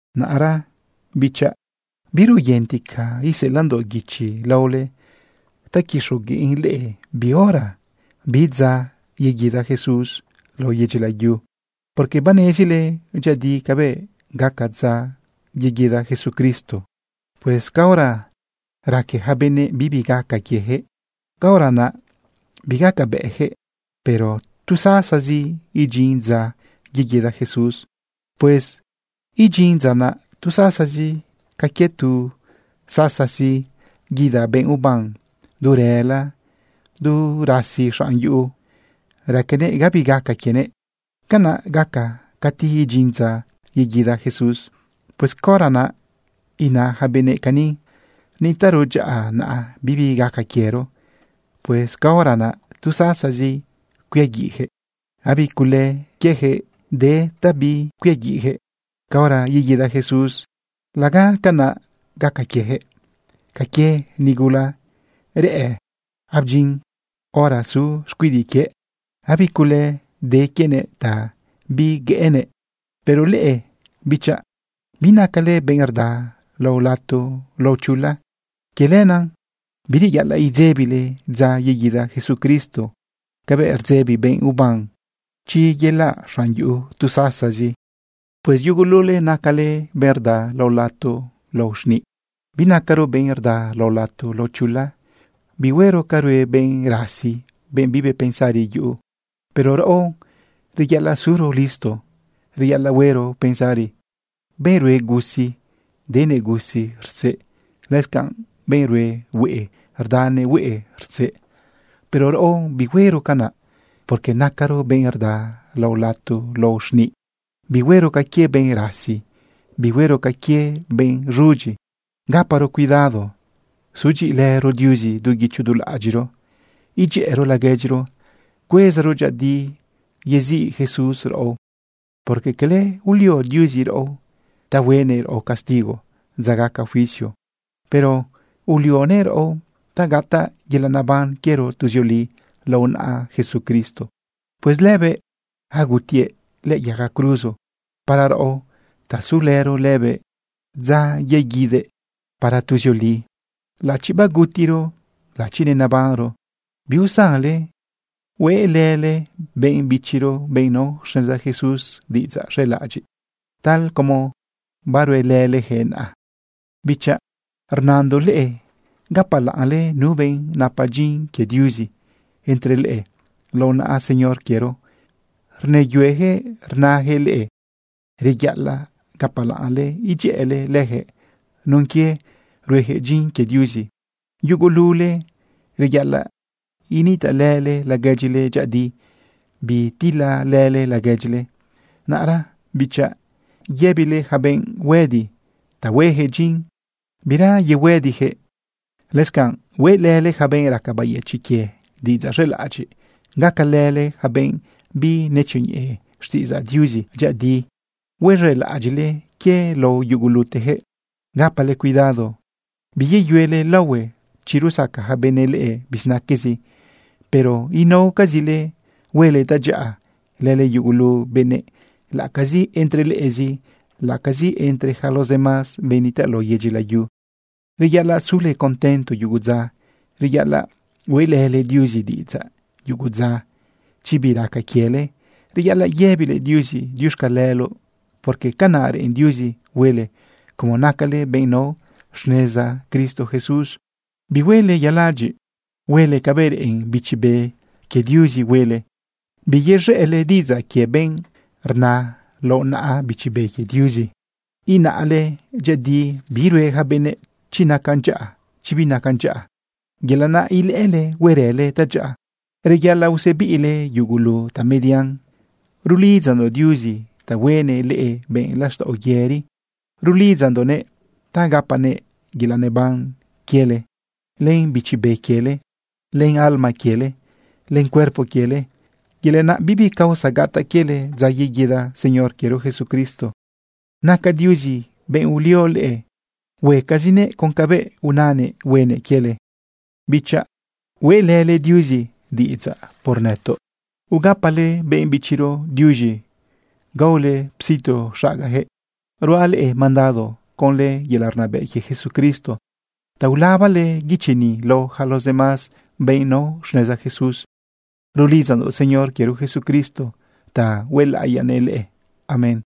Naꞌra, bichaꞌ, biraoyentica iseꞌelaꞌndoꞌ guichi laole ta quixogueꞌn leꞌe bi hora, bi dza, yeguida Jesús lao yedyi layu, porque banezile dyëꞌëdi cabëꞌ gaca dza yeguida Jesucristo. Pues caora raque yaca benëꞌ bibi gaca quiejëꞌ, caora naꞌ bigacabëꞌjëꞌ, pero tu sasazi idyin dza yeguida Jesús. Pues idyin dza naꞌ tu sasazi ca quie tu sasazi guida benꞌ uban du rëla du rasi xanꞌ yuꞌu, raquenëꞌ bibi gaca quienëꞌ. Canaꞌ gaca cati idyin dza yeguida Jesús. Pues caora naꞌ ina yaca benëꞌ cani: “Nitaꞌro dyaꞌa naꞌ, bibi gaca quiero”, pues caora naꞌ tu sasazi cuiaguiꞌyaquëꞌ. Gabi cule quieyaquëꞌ de ta bicuiaguiꞌyaquëꞌ caora yeguida Jesús. Laga canaꞌ gaca quieyaquëꞌ ca quie nigula rla abdyin hora su xcuidiꞌ quie, gabi cule de quienëꞌ ta biilanëꞌ. Pero leꞌe, bichaꞌ, binacale benꞌ rda lao lato lao chula. Quie lenaꞌ bireyaꞌalaꞌ idzebile dza yeguida Jesucristo cabëꞌ rdzebi benꞌ uban chi yelaꞌ xanꞌ yuꞌu tu sasazi. Pues yugulule nacale benꞌ rda lao lato lao xniꞌ. Binacaro benꞌ rda lao lato lao chula. Bihuero ca rue benꞌ rasi, benꞌ bibi pensari yuꞌu. Pero raꞌo, reyaꞌalaꞌ suro listo, reyaꞌalaꞌ huero pensari. Benꞌ rue gusi, denëꞌ gusi rtzeꞌ. Lëscanꞌ benꞌ rue hueꞌe, rdanëꞌ hueꞌe rtzeꞌ. Pero raꞌo, bihuero canaꞌ, porque nacaro benꞌ rda lao lato lao xniꞌ. Bihuero ca quie benꞌ rasi, bihuero ca quie benꞌ z̃udyi. Gaparo cuidado, zudyiꞌilëro Diuzi du guicho du laꞌadyiꞌro, idyëꞌëro laguedyiro, cuezaro dyëꞌëdi yeziꞌ Jesús raꞌo, porque cala ulio Diuzi raꞌo ta huenëꞌ raꞌo castigo dza gaca juicio, pero ulionëꞌ raꞌo ta gataꞌ yelaꞌ neban quiero tuzioli lao naꞌa Jesucristo. Pues lëbëꞌ agutiëꞌ lëꞌë yaga cruzo para raꞌo ta sulëro lëbëꞌ dza yeguidëꞌ para tuzioli, laꞌachi bagutiro, laꞌachi nenabanro. Biusanle huelële benꞌ bichiro, benꞌ nao xneza Jesús, diꞌidzaꞌ z̃elaꞌadyiꞌ, tal como baruelëleyaquëꞌ naꞌa. Bichaꞌ, rnandoꞌ leꞌe gapalaꞌnle nu benꞌ napa dyin quie Diuzi entre leꞌe. Lao naꞌa Señor quiero rnëyueyaquëꞌ rnaꞌyaquëꞌ leꞌe. Reyaꞌalaꞌ gapalaꞌnle idyëꞌële lëjëꞌ nun quie ruejëꞌ dyin quie Diuzi. Yugulule reyaꞌalaꞌ initaꞌlële laguedyile dyëꞌëdi, bitilalële laguedyile. Naꞌra, bichaꞌ, yëbile yaca benꞌ huëdi ta huejëꞌ dyin, bira yehuëdijëꞌ. Lëscanꞌ hueꞌlële yaca benꞌ raca bayëchiꞌ quie diꞌidzaꞌ z̃elaꞌadyiꞌ. Gacalële yaca benꞌ binetzioñeꞌe xtiꞌidzaꞌ Diuzi dyëꞌëdi. Huez̃elaꞌadyiꞌle quie lao yugulutejëꞌ. Gapale cuidado biyeyuele laohue chi rusaca yaca benëꞌ leꞌe bizinaquezi. Pero inaocazile huele tadyaꞌa lële yugulu benëꞌ, laꞌacazi entre leꞌezi, laꞌacazi entre yaca los demás benꞌ nitaꞌ lao yedyi layu. Reyaꞌalaꞌ sule contento yugo dza. Reyaꞌalaꞌ hueꞌlële Diuzi diꞌidzaꞌ yugo dza. Chi bi raca quiele, reyaꞌalaꞌ yëbile Diuzi diuxcaleloꞌ, porque canaꞌ reꞌen Diuzi huele como nacale benꞌ nao xneza Cristo Jesús. Bihuele yeladyiꞌ. Huele cabëꞌ reꞌen Bichi Be quie Diuzi huele. Biyez̃ëꞌle diꞌidzaꞌ quie benꞌ rna lao naꞌa Bichi Be quie Diuzi. Inaꞌle dyëꞌëdi bi rue yaca benëꞌ, chi nacan dyaꞌa, chi binacan dyaꞌa. Yelaꞌ naꞌ ilëꞌële huerële tadyaꞌa. Reyaꞌalaꞌ usebiꞌle yugulu tamedian. Rulidzandoꞌ Diuzi ta huenëꞌ leꞌe benꞌ laxtaꞌo yëri. Rulidzandoꞌnëꞌ ta gapanëꞌ yelaꞌ neban quiele, len bichi be quiele, len alma quiele len cuerpo quiele, yelaꞌ naꞌ bibi causa gataꞌ quiele dza yeguida Señor quiero Jesucristo. Naca Diuzi benꞌ ulio leꞌe. Huecazinëꞌ con cabëꞌ unanëꞌ huenëꞌ quiele. Bichaꞌ, hueꞌlële Diuzi diꞌidzaꞌ por nëtoꞌ. Ugapale benꞌ bichiro diuz̃i, gaole situ xagayaquëꞌ. Ruaꞌ leꞌe mandado conlë yelaꞌ rnabëꞌ quie Jesucristo ta ulabale guichi ni lao yaca los demás benꞌ nao xneza Jesús. Rulidzandoꞌ Señor quiero Jesucristo ta huelaꞌiyanëꞌ leꞌe. Amén.